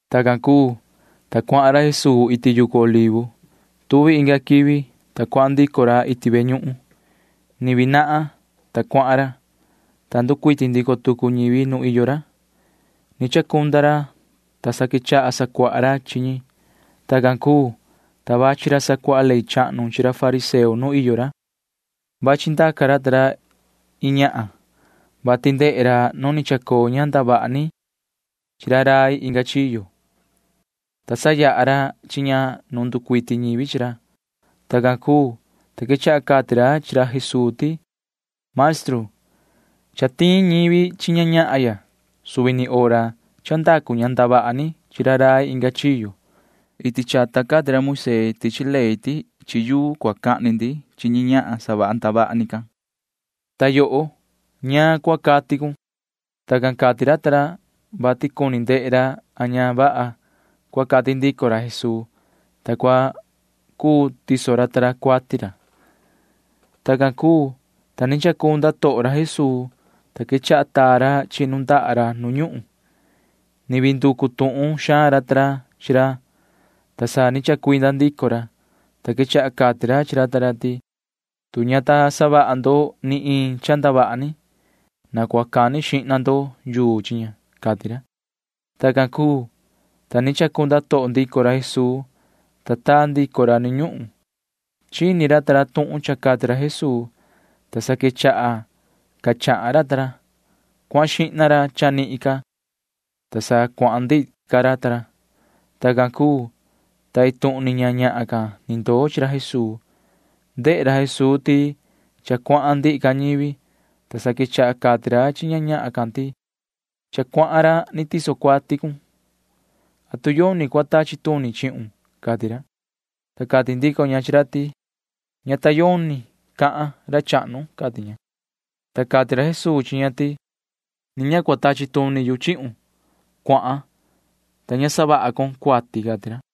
Tacan cuu, ta cuahan ra Jesuu iti yucu Olivo. Tuvi inga quivi, ta cuahan ndico ra iti ve ñuhun. Ni vii nahan, ta cuahan ra, ta nducuiti ndico tucu ñivi nu iyo ra. Ni chacunda ra, ta sa quechaha sacuaha ra chi ñi. Tacan cuu, ta vachi ra sacuaha ley chahnu chi ra fariseo nu iyo ra. Vachi ndaca ra ta ra iin ñahan, vati ndehe ra nu ni chacoo ña ndavaha ni chi ra rai inga chiyo, ta sayaha ra chi ña nu nducuiti ñivi chi ra. Tacan cuu, ta quechaha cati ra chi ra Jesuu ti: ―Maestru, cha tiin ñivi chi ñahya suvi ni hora cha ndacu ña ndavaha ni chi ra rai inga chiyo. Iti chata cati ra Moisee tichi ley ti chi yuu cua cahni ndi chi ñahan savaha ndavaha ni can, ta yoho, ¿ñaan cua cati cun? Tacan cati ra ta ra, vati cuni ndehe ra a ña vaha cua cati ndico ra Jesuu, ta cua cuu tiso ra ta ra cuati ra. Tacan cuu, ta ni chacunda toho ra Jesuu, ta sa quechaha taa ra chi nundaha ra nu ñuhun. Ni vii nducu tuhun xaan ra ta ra chi ra, ta sa ni chacuinda ndico ra, ta quechaha cati ra chi ra ta ra ti: ―Tu ña ta savaha ndo ni iin cha ndavaha ni, na cua cani xihna ndo yuu chi ña ―cati ra. Tacan cuu, ta ni chacunda toho ndico ra Jesuu, ta taa ndico ra nu ñuhun. Chini ra ta ra tuhun cha cati ra Jesuu, ta sa quechaha ca chahan ra ta ra. Cuahan xihna ra chanihin ca, ta sa cuahan ndihi ca ra ta ra. Tacan cuu, ta iin tuhun ni ña ñahan can ni ndoo chi ra Jesuu. Ndehe ra Jesuu ti cha cuahan ndihi ca ñivi, ta sa quechaha cati ra chi ña ñahan can ti: ―Yoho sihi, cha cuahan ra ni tiso cuati cun. ¿Atu yoni cua tachi tuni chihun? ―cati ra. Ta cati ndico ña chi ra ti: ―Ña ta yoni cahan, ra chahnu ―cati ña. Ta cati ra Jesuu chi ña ti: ―Ni ña cua tachi tuni yu chihun. Cuahan, ta ña savaha con cuati ―cati ra.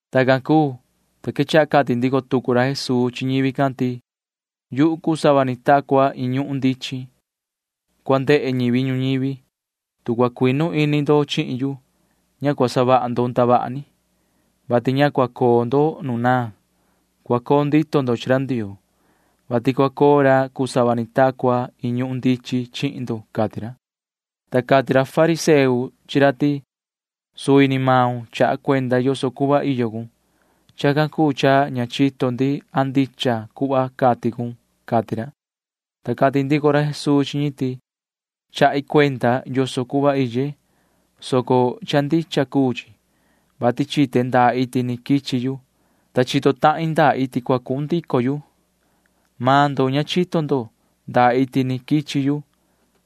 Tacan cuu, ta quechaha cati ndico tucu ra Jesuu chi ñivi can ti: ―Yuhu cuu sava ni ta cua iin ñuhun ndichin cua ndehe ñivi ñuñivi. Tu cua cuinu ini ndo chihin yu, ña cua savaha ndo ndavaha ni, vati ña cua coo ndo nu naan. Cua coo ndito ndo chi ra Ndioo, vati cua coo ra cuu sava ni ta cua iin ñuhun ndichin chihin ndo ―cati ra. Ta cati ra fariseo chi ra ti: ―Suvi ni maun chaha cuenda yoso cuhva iyo cun. Chacan cuu cha ña chito ndi a ndicha cuhva cati cun ―cati ra. Ta cati ndico ra Jesuu chi ñi ti: ―Chahi cuenda yoso cuhva iye, soco cha ndicha cuu chi, vati chite ndaa iti ni quichi yu, ta chito tahin ndaa iti cua cuhun ndico yu. Maan ndo ña chito ndo ndaa iti ni quichi yu,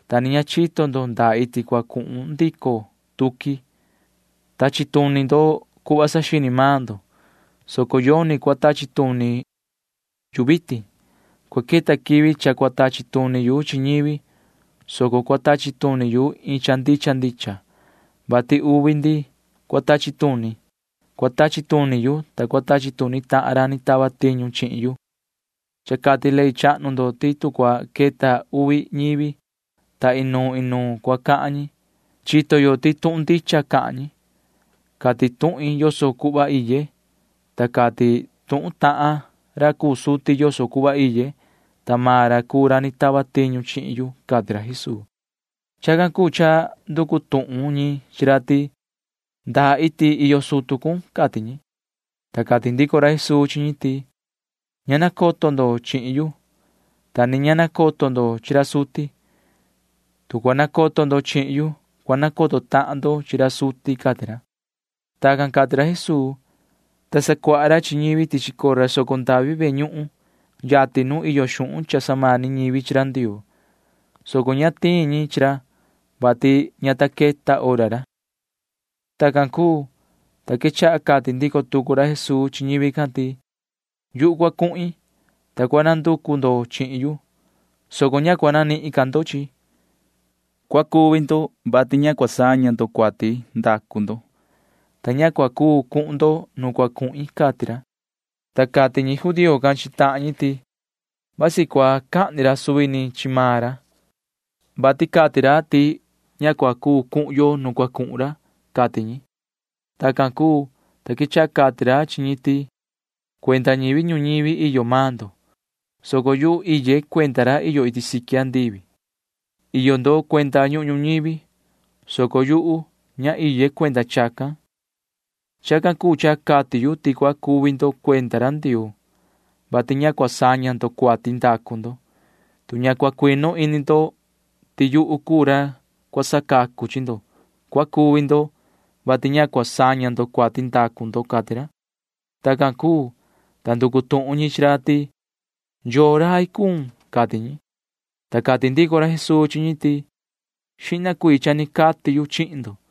ta ni ña chito ndo ndaa iti cua cuhun ndico tuqui. Tachi tuni ndo cuhva saxini maan ndo, soco yoni cua tachi tuni yu vitin. Cua queta quivi cha cua tachi tuni yu chi ñivi, soco cua tachi tuni yu iin cha ndicha ndicha, vati uvi ndi cua tachi tuni. Cua tachi tuni yu, ta cua tachi tuni tahan ra ni tava tiñu chihin yu. Cha cati ley chahnu ndo ti tu cua queta uvi ñivi, ta inuun inuun cua cahan ñi, chito yo ti tuhun ndicha cahan ñi. Cati tuhin yoso cuhva iye, ta cati tuhun tahan ra cuu suti yoso cuhva iye, ta maan ra cuu ra ni tava tiñu chihin yu ―cati ra Jesuu. Chacan cuu cha nducu tuhun ñi chi ra ti: ―¿Ndaa iti iyo sutu cun? ―cati ñi. Ta cati ndico ra Jesuu chi ñi ti: ―Ña nacoto ndo chihin yu, ta ni ña nacoto ndo chi ra suti. Tu cua nacoto ndo chihin yu, cua nacoto tahan ndo chi ra suti ―cati ra. Tacan cati ra Jesuu, ta sacuaha ra chi ñivi tichi cora soco ndavi ve ñuhun yatin nu iyo xuhun cha samani ñivi chi ra Ndioo, soco ña tiin ñi chi ra, vati ña ta queta hora ra. Tacan cuu, ta quechaha cati ndico tucu ra Jesuu chi ñivi can ti: ―Yuhu cua cuhin, ta cua nanducu ndo chihin yu, [soco ña cua nanihin ndo chihin yu]. Cua cuvi ndo, vati ña cua saña ndo cuati ndacu ndo, ta ña cua cuu cuhun ndo nu cua cuhin ―cati ra. Ta cati ñi judío can chi tahan ñi ti: ―Vasi cua cahni ra suvi ni chi maan ra, vati cati ra ti ña cua cuu cuhun yo nu cua cuhun ra ―cati ñi. Tacan cuu, ta quechaha cati ra chi ñi ti: ―Cuenda ñivi ñuñivi iyo maan ndo, soco yuhu iye cuenda ra iyo iti siqui andivi. Iyo ndo cuenda ñuhun ñuñivi, soco yuhu ña iye cuenda chacan. Chacan cuu cha cati yu ti cua cuvi ndo cuenda ra Ndioo, vati ña cua saña ndo cuati ndacu ndo. Tu ña cua cuinu ini ndo ti yuhu cuu ra cua sacacu chi ndo, cua cuvi ndo, vati ña cua saña ndo cuati ndacu ndo ―cati ra. Tacan cuu, ta nducu tuhun ñi chi ra ti: ―¿Yoo rai cuun? ―cati ñi. Ta cati ndico ra Jesuu chi ñi ti: ―Xihna cuii cha ni cati yu chihin ndo.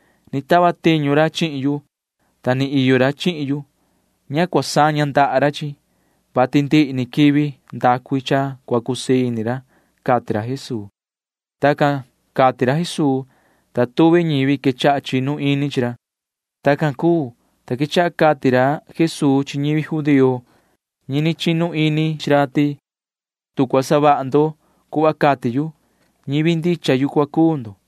Ni tava tiñu ra chihin yu, ta ni iyo ra chihin yu. Ña cua saña ihni ra chihin yu, vati ndihi ni quivi ndacu i cha cua cusii ini ra ―cati ra Jesuu. Tacan cati ra Jesuu, ta tuvi ñivi quechaha chinu ini chi ra. Tacan cuu, ta quechaha cati ra Jesuu chi ñivi judío ñi ni chinu ini chi ra ti: ―Tu cua savaha ndo cuhva cati yu, ñivi ndicha yu cua cuu ndo,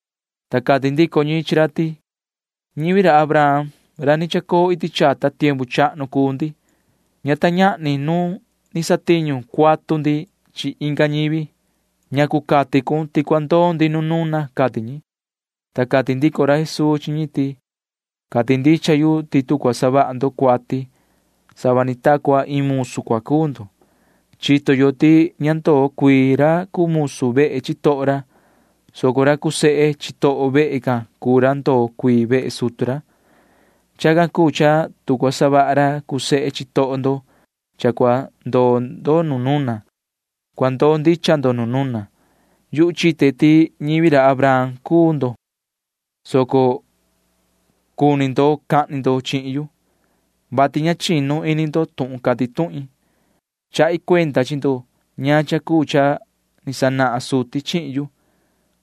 Ta cati ndico ñi chi ra ti: ―Ñivi ra Abraham ra ni chacoo iti chata tiempu chahnu cuu ndi. Ña ta ñahni nu ni satiñu cuatu ndi chi inga ñivi. ¿Ñacu cati cun ti cua ndoo ndi nu nuna? ―cati ñi. Ta cati ndico ra Jesuu chi ñi ti: ―Cati ndicha yu ti tu cua savaha ndo cuati, sava ni ta cua iin musu cua cuu ndo. Chito yo ti ña ndoo cuii ra cuu musu vehe chitoho ra, soco ra cuu sehe chitoho vehe can cuu ra ndoo cuii vehe sutu ra. Chacan cuu cha tu cua savaha ra cuu sehe chitoho ndo cha cua ndoo ndo nu nuna, cua ndoo ndicha ndo nu nuna. Yuhu chite ti ñivi ra Abraham cuu ndo, soco cuni ndo cahni ndo chihin yu, vati ña chinu ini ndo tuhun cati tuhin. Chahi cuenda chi ndo ñaan cha cuu cha ni sanahan suti chihin yu,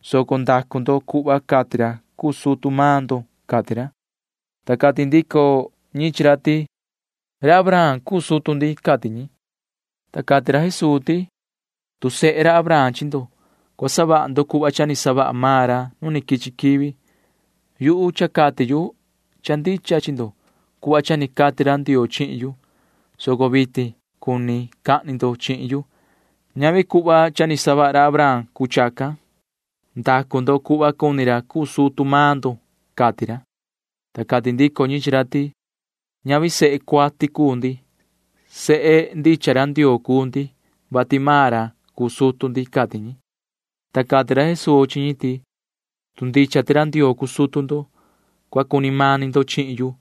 soco ndacu ndo cuhva cati ra cuu sutu maan ndo ―cati ra. Ta cati ndico ñi chi ra ti: ―Ra Abraham cuu sutu ndi ―cati ñi. Ta cati ra Jesuu ti: ―Tu sehe ra Abraham chi ndo, cua savaha ndo cuhva cha ni savaha maan ra nu quichi quivi. Yuhu cha cati yu cha ndicha chi ndo cuhva cha ni cati ra Ndioo chihin yu, soco vitin cuni cahni ndo chihin yu. Ñavi cuhva ni savaha ra Abraham cuu chacan. Ndacu ndo cuhva cuni ra cuu sutu maan ndo ―cati ra. Ta cati ndico ñi chi ra ti: ―Ñavi sehe cuati cuu ndi. Sehe ndicha ra Ndioo cuu ndi, vati maan ra cuu sutu ndi ―cati ñi. Ta cati ra Jesuu chi ñi ti: ―Tu ndicha ti ra Ndioo cuu sutu ndo, cua cuni mani ndo chihin yu,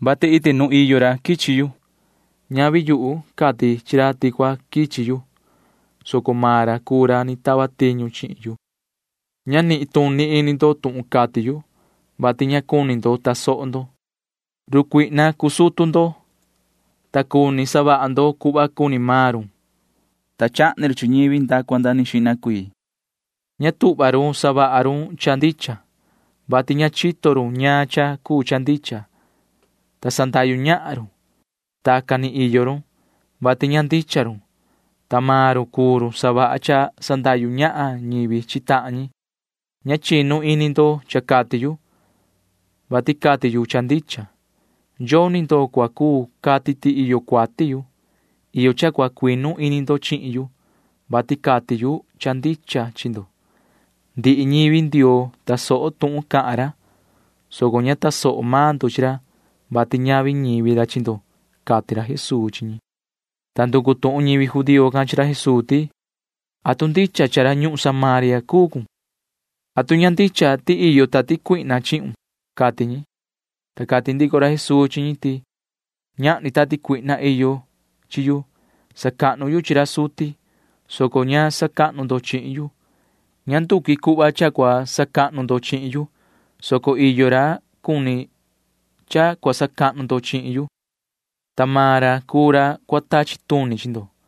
vati iti nuun iyo ra quichi yu. Ñavi yuhu cati chi ra ti cua quichi yu, soco maan ra cuu ra ni tava tiñu chihin yu. Ña nituni ini ndo tuhun cati yu, vati ña cuni ndo tasoho ndo. Run cuihna cuu sutu ndo, ta cuni savaha ndo cuhva cuni maan run, ta chahni run chi ñivi nda cua nda xihna cuii. Ña tuhva run savaha run cha ndicha, vati ña chito run ñaan cha cuu cha ndicha, ta sandahyu ñahan run. Tacan ni iyo run, vati ña ndicha run, ta maan run cuu run savaha cha sandahyu ñahan ñivi chi tahan ñi. Ña chinu ini ndo cha cati yu, vati cati yu cha ndicha. Yoni ndo cua cuu cati ti iyo cuati yu. Iyo cha cua cuinu ini ndo chihin yu, vati cati yu cha ndicha chi ndo. Ndihi ñivi Ndioo tasoho tuhun cahan ra, soco ña tasoho maan ndo chi ra, vati ñavi ñivi ra chi ndo ―cati ra Jesuu chi ñi. Ta nducu tuhun ñivi judío can chi ra Jesuu ti: ―¿Atu ña ndicha ti rai ñuhun Samaria cuun? ¿Atu ña ndicha ti iyo tati cuihna chihun? ―cati ñi. Ta cati ndico ra Jesuu chi ñi ti: ―Ñahni tati cuihna iyo chi yu. Sacahnu yu chi ra suti, soco ña sacahnu ndo chihin yu. Ña nduqui cuhva cha cua sacahnu ndo chihin yu, soco iyo ra cuni ra cha cua sacahnu ndo chihin yu, ta maan ra cuu ra cua tachi tuni chi ndo.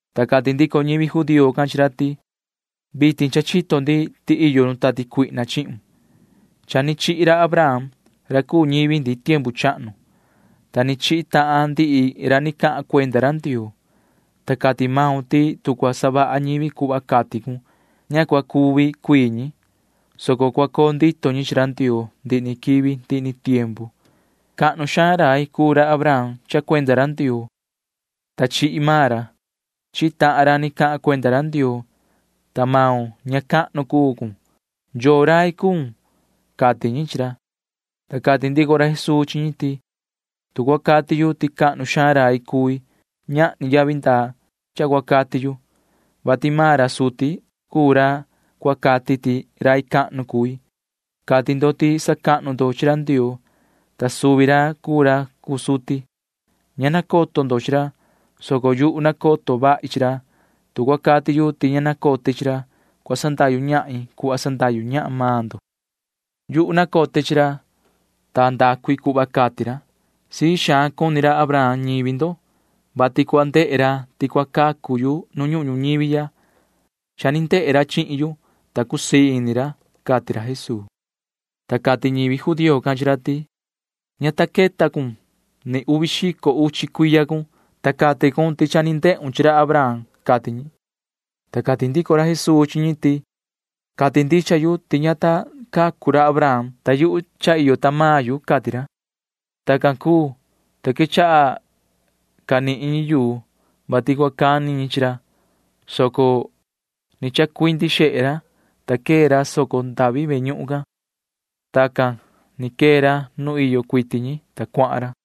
Ta cati ndico ñivi judío can chi ra ti: ―Vitin cha chito ndi ti iyo run tati cuihna chihun. Cha ni chihi ra Abraham ra cuu ñivi ndi tiempu chahnu, ta ni chihi tahan ndihi ra ni cahan cuenda ra Ndioo, ta cati maun ti tu cua savaha ñivi cuhva cati cun, ña cua cuvi cuii ñi, soco cua coo ndito ñi chi ra Ndioo ndihi ni quivi ndihi ni tiempu. Cahnu xaan rai cuu ra Abraham cha cuenda ra Ndioo, ta chihi maan ra. Chihi tahan ra ni cahan cuenda ra Ndioo, ta maun ña cahnu cun cuu. ¿Yoo rai cuun? ―cati ñi chi ra. Ta cati ndico ra Jesuu chi ñi ti: ―Tu cua cati yu ti cahnu xaan rai cui, ñahni yavi ndaa cha cua cati yu, vati maan ra suti cuu ra cua cati ti rai cahnu cui. Cati ndo ti sacahnu ndo chi ra Ndioo, ta suvi ra cuu ra cuu suti. Ña nacoto ndo chi ra, soco yuhu nacoto vahi chi ra. Tu cua cati yu ti ña nacote chi ra, cua sandahyu ñahin cuhva sandahyu ñahan maan ndo. Yuhu nacote chi ra, ta ndacu i cuhva cati ra. Sii xaan cuni ra Abraham ñivi ndo, vati cua ndehe ra ti cua cacu yu nu ñuhun ñuñivi ya. Cha ni ndehe ra chihin yu, ta cusii ini ra ―cati ra Jesuu. Ta cati ñivi judío can chi ra ti: ―Ña ta queta maun ni uvi xico uchi cuiya cun, ta cati cun ti cha ni ndehun chi ra Abraham ―cati ñi. Ta cati ndico ra Jesuu chi ñi ti: ―Cati ndicha yu ti ña ta cacu ra Abraham, ta cha ni iye ―cati ra. Tacan cuu, ta quechaha canihin ñi yuu, vati cua cani ñi chi ra, soco ni chacuindi xehe ra, ta quee ra soco ndavi ve ñuhun can. Tacan ni quee ra nu iyo cuiti ñi, ta cuahan ra.